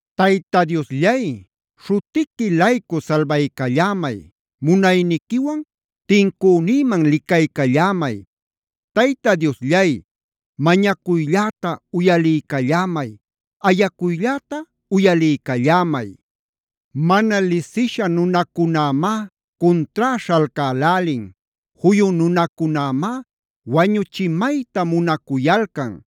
Tayta Diosllay, śhutiqui-laycu salbaycallämay. Munayniquiwan tincünïman licaycallämay. Tayta Diosllay, mañacuylläta uyaliycallämay. Ayacuylläta uyaliycallämay. Mana lisisha nunacunämá cuntrá śhalcälälin. Juyu nunacunämá wañuchimayta munacuyalcan.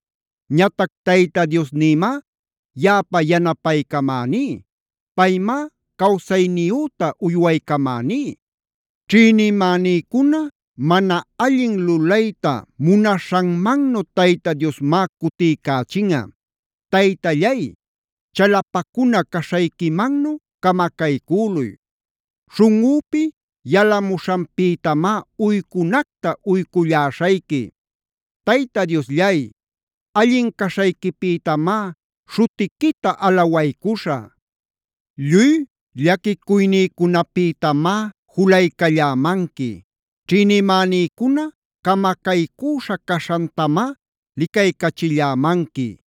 Ñatac Tayta Diosnïmá yaꞌapa yanapaycamäní. Paymá cawsayniyüta uywaycamäní. Ćhïnimänïcuna mana allin lulayta munaśhanmannu Tayta Diosmá cutiycächinꞌa. Taytallay, chalapacuna caśhayquimannu camacaycüluy. Śhunꞌüpi yalamuśhanpïtamá uycunacta uyculläśhayqui. Tayta Diosllay,d allin caśhayquipïtamá śhutiquita alawaycuśhä. Lluy llaquicuynïcunapïtamá julaycallämanqui. Ćhïnimänïcuna camacaycüśha caśhantamá licaycachillämanqui.